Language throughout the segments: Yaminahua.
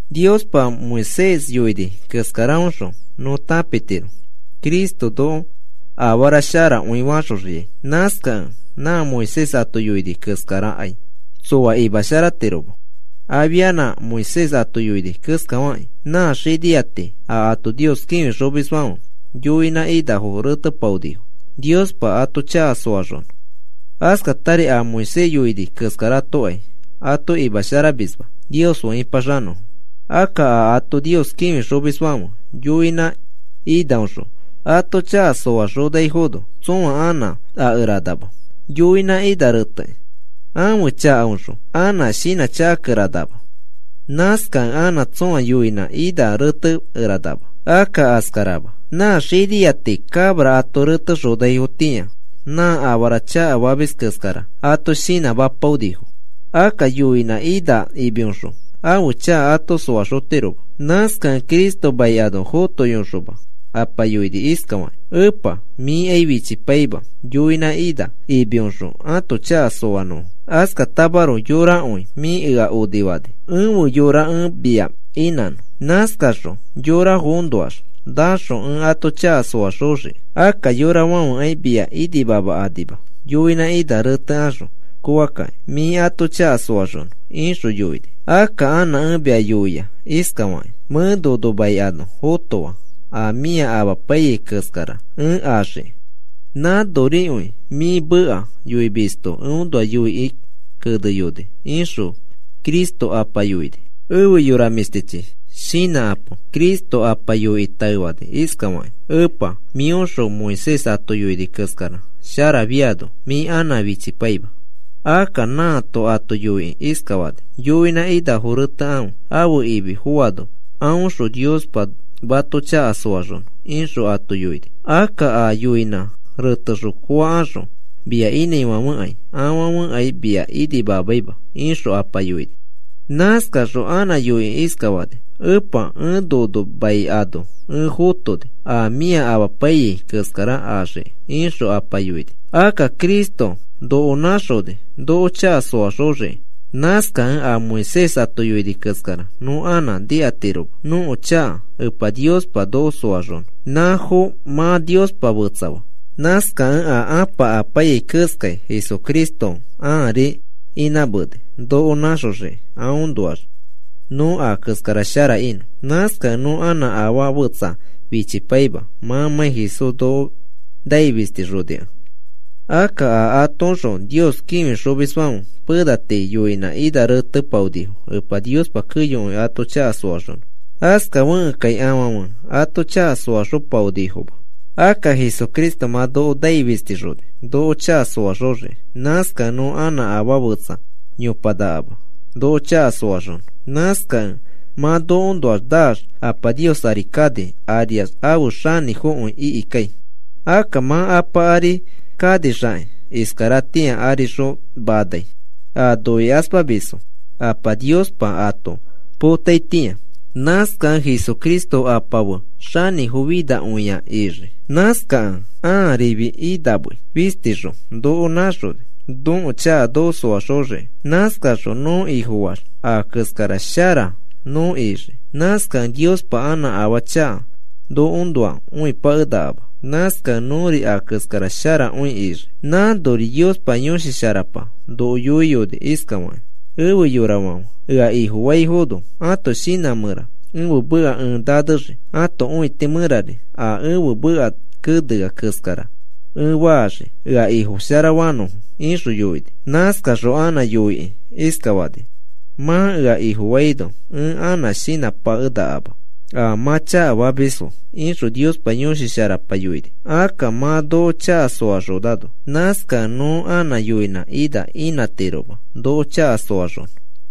Niospa Moisés yoini keskaraõxõ nõ tãpitiro Cristo noko afarasharakõi faxoxiai. Nãskakẽ nã Moisés ato yoini keskarakai tsoa imasharatiroma. Afia Moisés ato yoini keskafakĩ nã xinia tii a ato Nios kĩfixomisfãfe yoinã inafo retepaonifo Niospa ato chaka soaxonõ. Askatari a Moisés yoini keskaratokai ato imasharamisma Nios fe ĩpaxanõfo. Akka a ato Nios kĩfixomisfãfe yoinã inaoxõ ato chaka soaxonaifono, tsõa anã akeranama yoinã ina retekĩ. Ãfe chakaõxõ anã shinãchakakeranama. Nãskakẽ anã tsõa yoinã ina retekeranama. Akka askarama. Nã xinia tii cabra ato retexonaifotĩa nã afara chakafamis keskara ato shinãmapaonifo. Akka yoinã ina imioxõ ãfe chaka ato soaxotiroma. Nãskakẽ Cristo mai ano fotoyoxoma Apa yoini iskafakĩ: Epa, mĩkai fichipaima yoinã ina imioxõ ãto chaka soanõfo. Askatamaroko yorakõi mĩa ea onifani ẽfe yora ẽ mia inãnõ. Nãskaxõ yorafoõnoax naxõ ẽ ato chaka soaxoxiki. Akka yorafãfekai mia inimamakanima yoinã ina retekaxõ kooakĩ mĩ ato chaka soaxonõ, ixõ yoini. Akka anã mẽ mia yoia iskafakĩ: Mẽ nono mai ano fotoa a mĩa amapaiyai keskara ẽ axiki. Nãnorikõi mĩ meka yoimisto eõnoa yoikĩ keneyoni, ixõ Cristo Apa yoini. Efe yora mĩshtichi, shinãkapo. Cristo Apa yoikĩ taefani iskafakĩ: “Epa, mĩõxõ Moisés ato yoini keskara sharafiano mĩ anã fichipaima. Akka nãato ato yoikĩ iskafani: ‘Yoinã inafo retekãfe ãfe imi foano aõxõ Niospa mato chaka soaxonõ,’ ixõ ato yoini. Akka a yoinã retexõ koakaxõ mia inãifãfekai afãfekai mia inimamaima,” ixõ Apa yoini. Nãskaxõ anã yoikĩ iskafani: “Epa, ẽ nono mai ano ẽ fotoni a mĩa amapaiyai keskara axiki,” ixõ Apa yoini. Akka Cristo noko nãxoni noko chaka soaxoxiki. Nãskakẽ a Moisés ato yoini keskara nõ anã nikatiroma nõko chaka Epa Niospa noko soaxonõ. Nãfo mã Niospa fetsafaa. Nãskakẽ a Apa amapaiyai keskai Jesucristo ãari inãmeni noko nãxoxikĩ aõnoax nõ a keskara shara inõ. Nãskakẽ nõ anã afaa fetsa fichipaima mãmãi Jesús noko nai fistixonikẽ. Akka a atoõxõ Nios kĩfixomisfãfe pena tii yoinã ina retepaonifo Epa Niospa keyokõi ato chaka soaxonõ. Askafekẽkai afãfe ato chaka soaxopaonifoma. Akka Jesucristo mã noko nai fistixoni noko chaka soaxoxiki. Nãskakẽ nõ anã afaa fetsa yopanakama noko chaka soaxonõ. Nãskakẽ mã nokoõnoax naax Apa Nios ari kani ariax afe xanĩfokõi ikikai. Akka mã Apa ari kanixakĩ iskaratĩa arixõ manai, a noikaspamisfo Apa Niospa ato potaitĩa. Nãskakẽ Jesucristo Apa fe xanĩfofinakõia ixii. Nãskakẽ ãarifi inãmei fistixõ noko nãxoni nõko chaka noko soaxoxiki. Nãskaxõ nõ Ifofaax a keskara shara nõ ixii. Nãskakẽ Niospa anã afaa chaka nõkoõnoa õipakenakama. Nãskakẽ nõri a keskara sharakõi ixii. Nãnori Niospa Yõshi Sharapa noko yoiyoni iskafakĩ: Efe yorafãfe, ea Ifofaifono ãto shinã mẽra ẽfe meka ẽ nanexii ãto õiti mẽrari a ẽfe meka kenea keskara ẽ faxii ea Ifofasharanõfo, ixõ yoini. Nãskaxõ anã yoikĩ iskafani: Mã ea Ifofaino ẽ anã shinãpakenakama a mã chakafamisfo, ixõ Niospa Yõshi Sharapa yoini. Akka mã noko chaka soaxonano, nãskakẽ nõ anã yoinã ina inãtiroma noko chaka soaxonõ.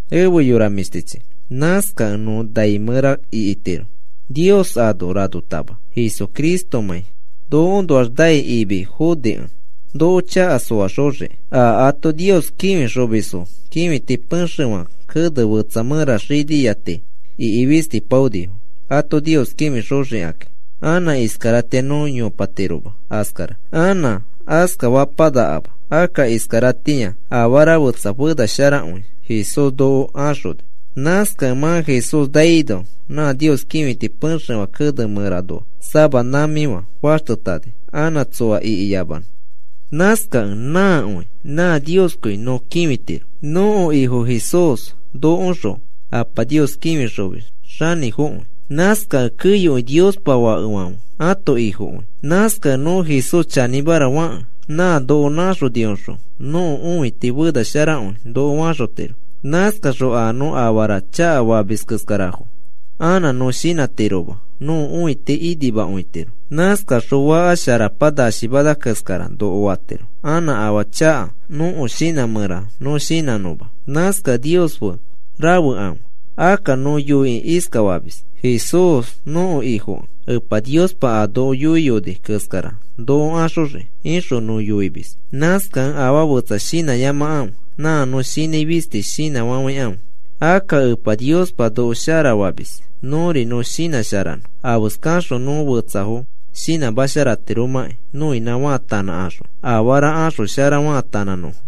Efe yora mĩshtichi, nãskakẽ nõ nai mẽra ikitiro Nios ano ranotama Jesucristomãi nokoõnoax nai imi fonikẽ, noko chaka soaxoxiki. A ato Nios kĩfixomisfo kĩfiti pexefã kene fetsa mẽra xinia tii ikifistipaonifo ato Nios kĩfixoxikakĩ. Anã iskaratĩa nõ yopatiroma askara. Anã askafapanakama. Akka iskaratĩa afara fetsa fenasharakõi Jesús noko axoni. Nãskakẽ mã Jesús naino nã Nios kĩfiti pexefã kene mẽranoa sama nãmĩfã faxtetani anã tsoa ikiyamanõ. Nãskakẽ nãkõi nã Nioskõi nõ kĩfitiro. Nõko Ifo Jesús nokoõxõ Apa Nios kĩfixomis xanĩfokõi. Nãskakẽ keyokõi Niospa fakefãfe ãto Ifokõi. Nãskakẽ nõ Jesús chanĩmara fakẽ nã noko nãxonioxõ nõko õiti fena sharakõi noko faxotiro. Nãskaxõ a nõ afarafo chakafamis keskarafo anã nõ shinãtiroma nõko õiti inimakõitiro. Nãskaxõ faka sharapa nashimana keskara noko fatiro anã afaa chaka nõko shinã mẽraxõ nõ shinãnõma. Nãskakẽ Nios fe rafekãfe. Akka nõ yoikĩ iskafamis: “Jesús nõko Ifokẽ Epa Niospa a noko yoiyoni keskara noko axoxii,” ixõ nõ yoimis. Nãskakẽ afaa fetsa shinãyamakãfe. Nã nõ shinãi fisti shinãfafãikãfe. Akka Epa Niospa noko sharafamis. Nõri nõ shinãsharanõ afeskaxõ nõ fetsafo shinãmasharatiromãkĩ nõinã faatanãkaxõ afara axoshara faatanãnõfo.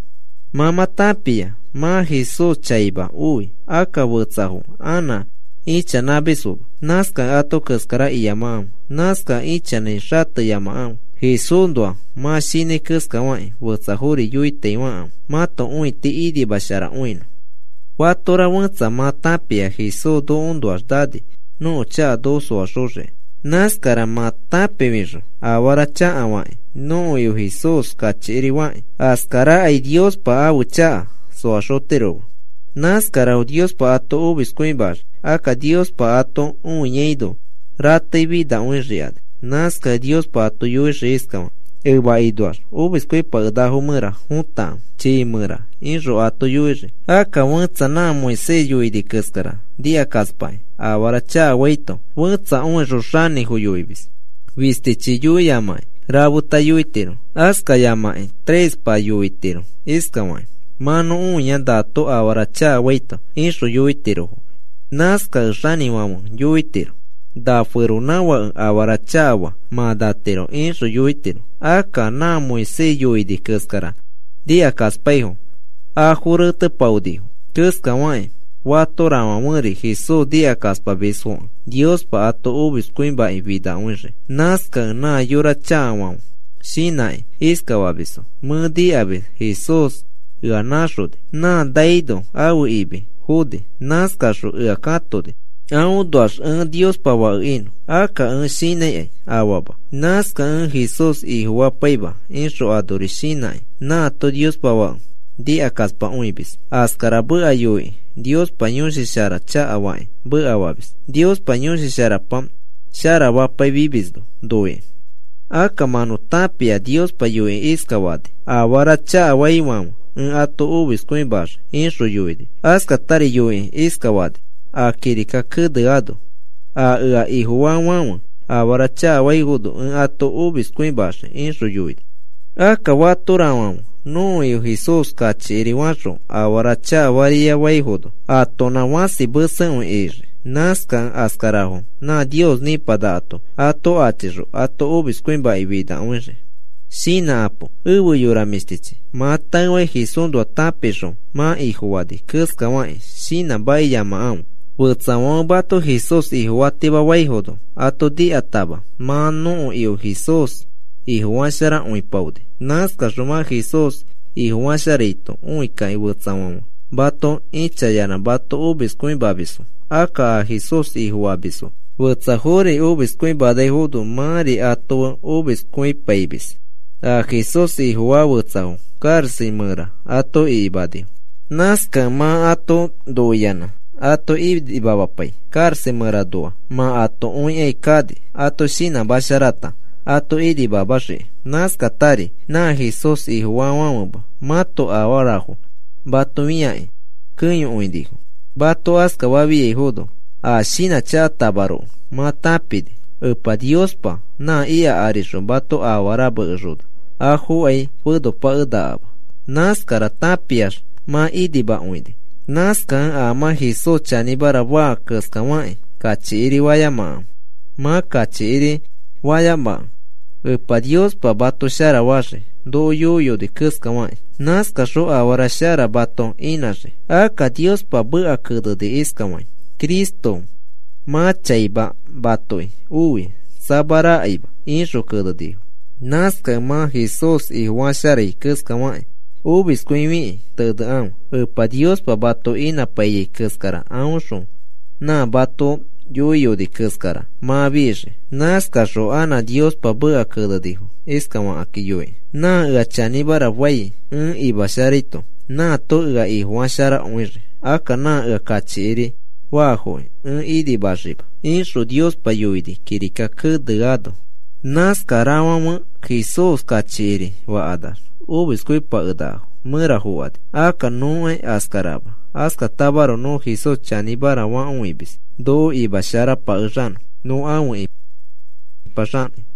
Mã mã tãpia mã Jesús chaima oi. Akka fetsafo anã ichanãmisfoma. Nãskakẽ ato keskara iyamakãfe. Nãskakẽ ichanãi xateyamakãfe. Jesúsnoa mã shinãi keskafakĩ fetsafori yoitaifakãfe mãto õiti inimasharakõinõ. Fatora fẽtsa mã tãpia Jesús nokoõnoax nani nõko chaka noko soaxoxiki. Nãskara mã tãpifixõ afara chakafakĩ nõko Ifo Jesús kachikiri fakĩ, askarakai Niospa ãfe chaka soaxotiroma. Nãskarafo Niospa ato omiskõimaxii. Akka Niospa ato õiaino ratei finakõixikani. Nãskakẽ Niospa ato yoixii iskafakĩ: “Emakinoax omiskõipakenakafo mẽra fotakãfe, chiifã mẽra,” ixõ ato yoixii. Akka fẽtsa nã Moisés yoini keskara nikakaspakĩ afara chakafaito fẽtsa õixõ xanĩfo yoimis. Fistichi yoiyamakĩ rafeta yoitiro, askayamakĩ trespa yoitiro iskafaki: “Mã nõ õia nato afara chakafaito,” ixõ yoitirofo. Nãskakẽ xanĩfãfe yoitiro: “Na feronãfãke afara chakafaa mã natiro,” ixõ yoitiro. Akka nã Moisés yoini keskara nikakaspaifo afo retepaonifo keskafakĩ fatorafãferi Jesús nikakaspamisfokẽ Niospa ato omiskõimakĩ finakõixii. Nãskakẽ nã yora chakafãfe shinãkĩ iskafamisfo: “Mẽ nikamis Jesús ea nãxoni. Nã naino ãfe imi foni. Nãskaxõ ea katoni aõnoax ẽ Niospa fake inõ. Akka ẽ shinãikai afama. Nãskakẽ ẽ Jesús Ifofapaima,” ixõ anori shinãkĩ nãato Niospa Fake nikakaspakõimis. Askara meka yoikĩ Niospa Yõshi Shara chakafakĩ mekafamis, Niospa Yõshi Sharapa sharafafiamisno noikĩ. Akka mã nõ tãpia Niospa yoikĩ iskafani: “Afara chakafaifãfe ẽ ato omiskõimaxii,” ixõ yoini. Askatari yoikĩ iskafani a kirika keneano: “A ea Ifofaafãfe afara chakafaifono ẽ ato omiskõimaxii,” ixõ yoini. Akka fatorafãfe nõko Ifo Jesús kachikiri fakaxõ afara chakafariafaifono atonã fãsi mesekõi ixii. Nãskakẽ askarafo nã Nios nĩpanakato ato achixõ ato omiskõimakĩ finakõixii. Shinãkapo efe yora mĩshtichi. Mã taefakĩ Jesúsnoa tãpixõ mã Ifofani keskafakĩ shinãmakiyamakãfe. Fetsafãfe mato Jesús Ifofatimafaifono ato nikatama mã nõko Ifo Jesús Ifofasharakõipaoni. Nãskaxõ mã Jesús Ifofasharaito õikakĩ fetsafãfe mato ĩchayanã mato omiskõimamisfo. Akka a Jesús Ifofamis fetsafori omiskõiaifono mãri ato fe omiskõipaimis. A Jesús Ifofaa fetsafo karaxa mẽra ato ikimanifo. Nãskakẽ mã ato noiyanã ato inimamapai karaxa mẽranoa mã ato õikai kani ato shinãmasharata ato inimamaxiki. Nãskatari nã Jesús Ifofaafãfema mãto afarafo mato fĩakĩ keyokõinifo. Mato askafafiaifono a shinãchakatamaroko mã tãpini Epa Niospa nã ika arixõ mato afara mekexona afokai fenopakenakama. Nãskara tãpiax mã inimakõini. Nãskakẽ a mã Jesús chanĩmara faa keskafakĩ kachikiri fayamakãfe. Mã kachikiri fayamakẽ Epa Niospa mato sharafaxii noko yoiyoni keskafakĩ. Nãskaxõ afara shara mato inãxii. Akka Niospa meka keneni iskai: Cristo mã chaima matoki oi, samarakaima, ixõ kenenifo. Nãskakẽ mã Jesús Ifofasharai keskafakĩ omiskõifikĩ tenekãfe. Epa Niospa mato inãpaiyai keskara aõxõ nã mato yoiyoni keskara mã fixii. Nãskaxõ anã Niospa meka kenenifo iskafakĩ yoikĩ: Nã ea chanĩmara fai ẽ imasharaito, nãato ea Ifofasharakõixii. Akka nã ea kachikiri faafoki ẽ inimaxima, ixõ Niospa yoini kirika keneano. Nãskarafãfe Jesús kachikiri fakanax omiskõipakenakofo mẽra fokani. Akka nõkai askarama. Askatamaroko nõ Jesús chanĩmara fakõimis noko nimasharapakexanõ nõ afe ipaxakĩ.